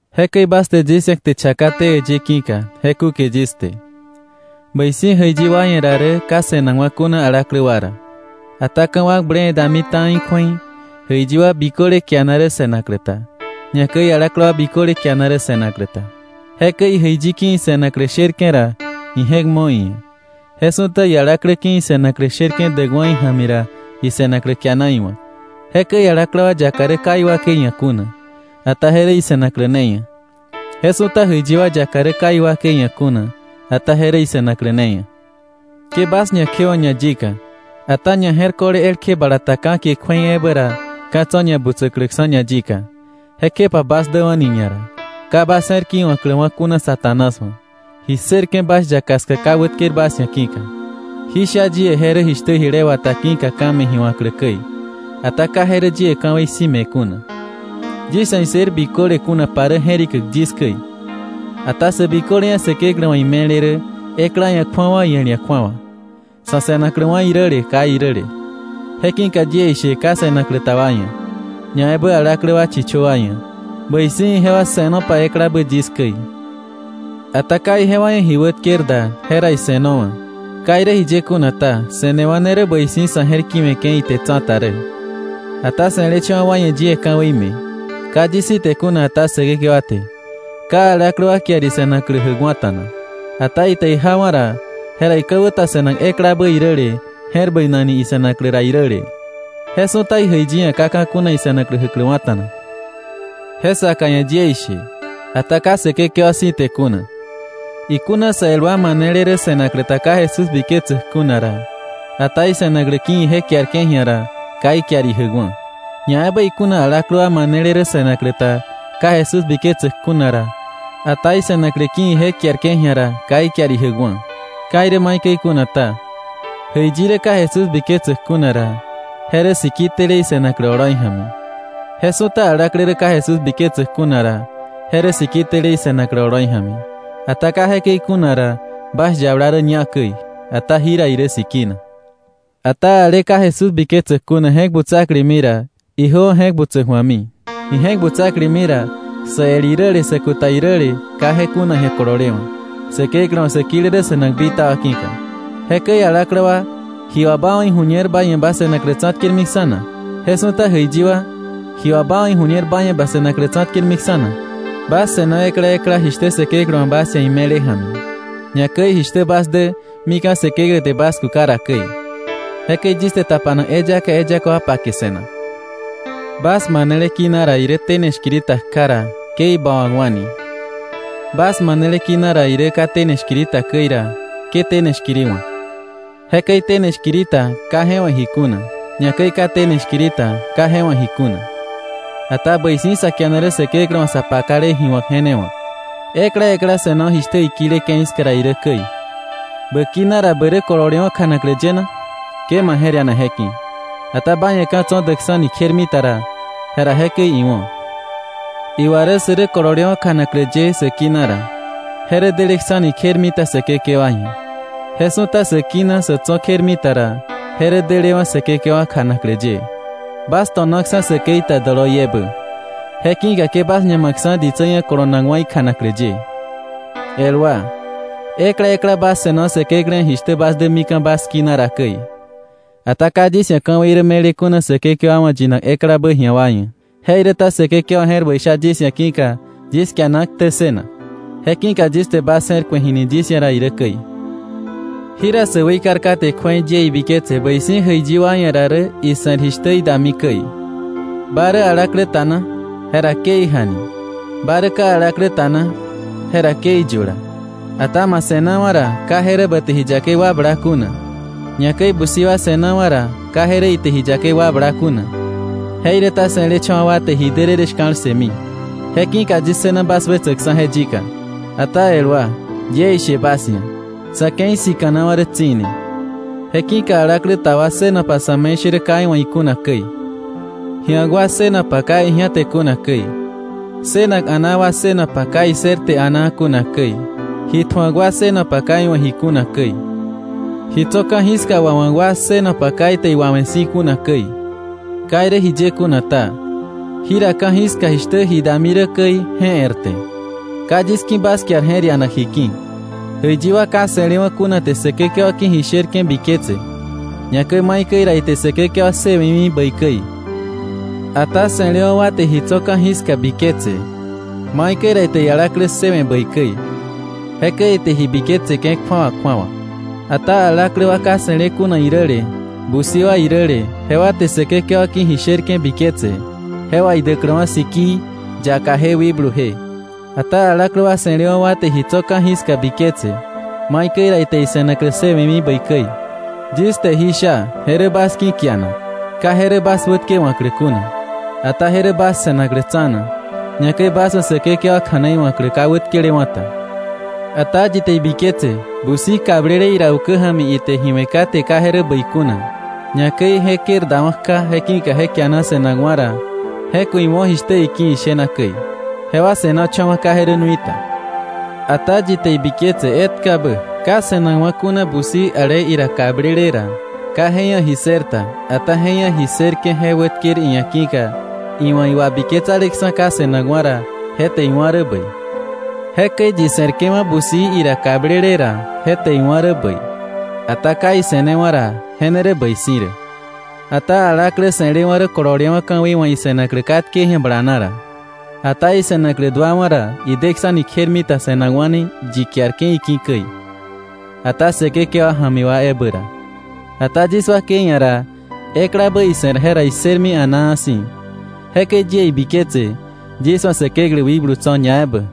Jekäi bas te yis ia̱ kte chakaté äyë ki̱ka je kúke yis te. Bäi si̱ jäiyi wa ia̱ ra rä ka se̱nakwa̱ kuna alaklä wa ra. Ata ka̱wakble dami ta̱i kju̱ei, jäiyi wa biköle kiana rä se̱naklä ta, ñakäi alaklä wa biköle kiana rä se̱naklä ta. Jekäi ijäiyi ki̱ ise̱naklä sherke̱ ra, ije̱k mo̱ iia̱; je su̱ta ialaklä ki̱ ise̱naklä sherke̱ däkwa̱ ija̱mi ra, ise̱naklä kiana iwa̱k. Jekäi alaklä wa yaka rä ka iwakei ia̱ kuna, ata je rä ise̱naklä ne ia̱. Je su̱ta jäiyi wa yaka rä ka iwakei ia̱ kuna, ata je rä ise̱naklä ne ia̱. Ke bas ñakjewa̱k ñayika, ata ñaje̱rko̱le elkje bala ta ka̱kie kju̱ei ebä ra ka̱ tso̱ ñabutsäkläksa̱ ñayika. Jekjepa bas däwa̱ni ñara, ka bas je̱r ki̱wa̱kläwa̱ kuna Satanás wa̱, ji ssërke̱ bas yaka ska ka wätker bas ia̱ ki̱ka. Jí sha yie, je rä jishtä jile wata ki̱ka ka̱ me̱ ji wa̱klä käi; ata ka je rä yie ka̱wei si̱ me̱ kuna. Yis ia̱ issër biköle kunapa rä je̱rikäk yis käi. Ata sä biköle ia̱ Säkeklä wa̱ ime̱le rä, ekla ia̱ kju̱awa iel ia̱ kju̱awa, sa̱ se̱nakläwa̱ iräle kai iräle. Je ki̱ka yie ishe ka se̱naklä ta wa ia̱, ñaebä alaklä wa chichö wa ia̱, bäi si̱ ijewa se̱nopa eklabä yis käi. Ata ka ijewa ia̱ ji wätker da, jera ise̱nowa̱. Ka irä jiye kuna ta, se̱newa̱ ne rä bäi si̱ sa̱ je̱r ki̱we̱ke̱ ite tsa̱ta rä. Ata se̱lecha̱wa̱ wa ia̱ yie ka̱wei me̱, ka yis si̱ te kuna ata Säkekewa te, ka alaklä wa kiar ise̱naklä jäkwa̱ta̱na. Ata ite ijawa̱ ra, jera ika̱wä ta se̱nak eklabä iräle je̱r bäinakni ise̱naklä ra iräle. Je su̱ta ijäiyi ia̱ ka ka̱ kuna ise̱naklä jäkläwa̱ta̱na. Je saka ia̱ yie ishe, ata ka Säkekewa si̱ te kuna, ikuna sä el wa manele rä se̱naklä ta ka Jesús biketsäk kuna ra, ata ise̱naklä ki̱ ije kiarke̱ ji̱a ra, ka ikiar ijäkwa̱. Ñaebä ikuna alaklä wa manele rä se̱naklä ta ka Jesús biketsäk kuna ra, ata ise̱naklä ki̱ ije kiarke̱ ji̱a ra, ka ikiar ijäkwa̱. Ka irä maikäi kuna ta, jäiyi rä ka Jesús biketsäk kuna ra, je rä siki tele ise̱naklä oloi ja̱mi. Je su̱ta alaklä rä ka Jesús biketsäk kuna ra, je rä siki tele ise̱naklä oloi ja̱mi. Ata ka jekäi kuna ra, bas yabala rä ñá käi, ata jira irä sikina. Ata ale ka Jesús biketsäk kuna je̱k butsaklemi ra, ijöwa̱ je̱k butsäk ju̱ami. Ije̱k butsaklemi ra, sä el iräle sä kuta iräle ka je kuna ji̱a kololewa̱, Säkeklä wa̱ sä kile rä se̱nak bitaba ki̱ka. Jekäi alaklä wa, ¿ji wà ba wa̱ ijuñer ba ia̱ ba se̱naklä tsa̱tkermiksa̱ na? Je su̱ta jäiyi wa, ¿ji wà ba wa̱ iju̱ñer ba ia̱ ba se̱naklä tsa̱tkermiksa̱ na? Bas se̱no ekla ekla jishtä Säkeklä wa̱ bas ia̱ ime̱le ja̱mi, ñakäi jishtä bas dä mika̱ Säkeklä te bas kuka ra käi. Jekäi yis te tapanak eyaka eyaka wa pake se̱nak. ¿Bas manele kina rä tene shkiri ta kja na? Jera ke je bawa̱kwa̱ni. ¿Bas manele kina rä ka tene shkiri ta käi na? Jera ke tene shkiri wa̱k. Jekäi tene shkiri ta, ka je wa̱ ji kuna, ñakäi ka tene shkiri ta, ka je wa̱ ji kuna. Ata bäi si̱ sa kiana rä Säkeklä wa̱ sa pakale ji wa̱k je ne wa̱k. Ekla ekla se̱no jishtä ikile ke̱i ska ra irä käi. ¿Bä kina ra bä rä kololewa̱ kjanaklä ye na? Ke ma je̱r iana je ki̱. Ata ba ia̱ ka̱ tso̱ däksa̱ni kjermita ra, jera jekäi iwo̱. Iwa rä sä rä kololewa̱ kjanaklä ye sä kina ra, je rä deleksa̱ni kjermita Säkekewa ia̱. Je su̱ta sä kina sä tso̱ kjermita ra, je rä delewa̱ Säkekewa kjanaklä ye. Bas to̱naksa̱ säkei ta doloiebä; je ki̱ka ke bas ñamakksa̱ ditsä ia̱ kolonakwa̱ ikjanaklä ye. El wa, ekla ekla bas se̱no Säkeklä ia̱ jishtä bas dä mika̱ bas kina ra käi. Ata ka yis ia̱ ka̱wei rä me̱le kuna Säkekewa wa̱ yinak eklabä ji̱a wa ia̱. Jeiräta Säkekewa je̱r bäi sha yis ia̱ ki̱ka yis kiana ktä ssënak. Je ki̱ka yis te bas je̱r ku̱e jini yis ia̱ ra irä käi. Jira sä weikar kate kju̱ei yie ibiketse bäi si̱ jäiyi wa ia̱ ra rä ise̱r jishtä idami käi. ¿Ba rä alaklä ta na? Jra ke ijani. ¿Ba rä ka alaklä ta na? Jera ke iyula. Ata ma se̱nawa̱ ra, ka je rä ba te ji yakei wakbla kuna. Ñakäi busi wa se̱nawa̱ ra, ka je rä ite ji yakei wakbla kuna. Jeiräta se̱lecha̱wa̱ wa te ji därërë shka̱l ssëmi. Je ki̱ka yis ssëna bas wetsäkksa̱ je yika. Ata el wa, yie ishe bas ia̱, sa̱ ke̱i sika̱nawa̱ rä tsi̱ne. Je ki̱ka alaklä ta wa ssënopa sa̱me̱ishärä ka iwa̱ ikuna käi, ji̱ak wa ssënopa ka iji̱ate kuna käi; ssënak a̱naa wa ssënopa ka issërte a̱naa kuna käi; ji tju̱ak wa ssënopa ka iwa̱ ji kuna käi, ji tso̱ ka̱jiska wawa̱k wa ssënopa ka ite iwawe̱ si̱ kuna käi. Ka irä jiye kuna ta, jira ka̱jiska jishtä ji dami rä käi, je e̱rte. Ka yis ki̱ bas kiar je̱r ianak ji ki̱. Jäiyi wa ka se̱lewa̱ kuna te Säkekewa ki̱ ji sherke̱ biketse, ñakäi maikäi ra ite Säkekewa ssëwe̱mi bäi käi. Ata se̱lewa̱ wa te ji tso̱ ka̱jiska biketse, maikäi ra ite ialaklä ssëwe̱ bäi käi. Jekäi ite ji biketseke̱ kju̱awa kju̱awa. Ata alaklä wa ka se̱le kuna iräle, busi wa iräle, jewa te Säkekewa ki̱ ji sherke̱ biketse, je wà idäkläwa̱ sikii, yakaje wikbluje. Ata alaklä wa se̱lewa̱ wa te ji tso̱ ka̱jiska biketse, maikäi ra ite ise̱naklä ssëwe̱mi bäi käi. Yis te jí sha je rä bas ki̱ kianak; ka je rä bas wätkewa̱klä kuna, ata je rä bas se̱naklä tsa̱na, ñakäi bas wa̱ Säkekewa kja̱nei wa̱klä ka wätkelewa̱ ta. Ata yi te ibiketse busi kablele ira ukä ja̱mi ite ji we̱ kate ka je rä bäi kuna, ñakäi je kër dawa̱ kja, je ki̱ka je kiana se̱nakwa̱ ra, je ku̱ iwo̱ jishtä iki̱ ishena käi. Jewa se̱nocha̱wa̱, ka je rä nui ta. Ata yi te ibiketse etkabä ka se̱nakwa̱ kuna busi ale ira kablele ra, ka je ia̱ ji ssër ta, ata je ia̱ ji ssërke̱ je wätker iia̱ ki̱ka iwa̱ iwabiketsaleksa̱ ka se̱nakwa̱ ra, je te iwá̱ rä bäi. Jekäi yi se̱rke̱wa̱ busi ira kablele ra, je te iwa̱ rä bäi; ata ka ise̱newa̱ ra, je ne rä bäi si̱ rä. Ata alaklä se̱lewa̱ rä kololewa̱ ka̱wei wa̱ ise̱naklä katke ji̱a bala na ra. Ata ise̱naklä duawa̱ ra, ideksa̱ni kjermita se̱nakwa̱ni yi kiarke̱ iki̱ käi, ata Säkekewa ja̱mi wa ebä ra. Ata yis wakei ia̱ ra, eklabä ise̱r jera issërmi a̱naa si̱. Jekäi yie ibiketse, yis wa̱ Säkeklä wikblu tso̱ ñaebä.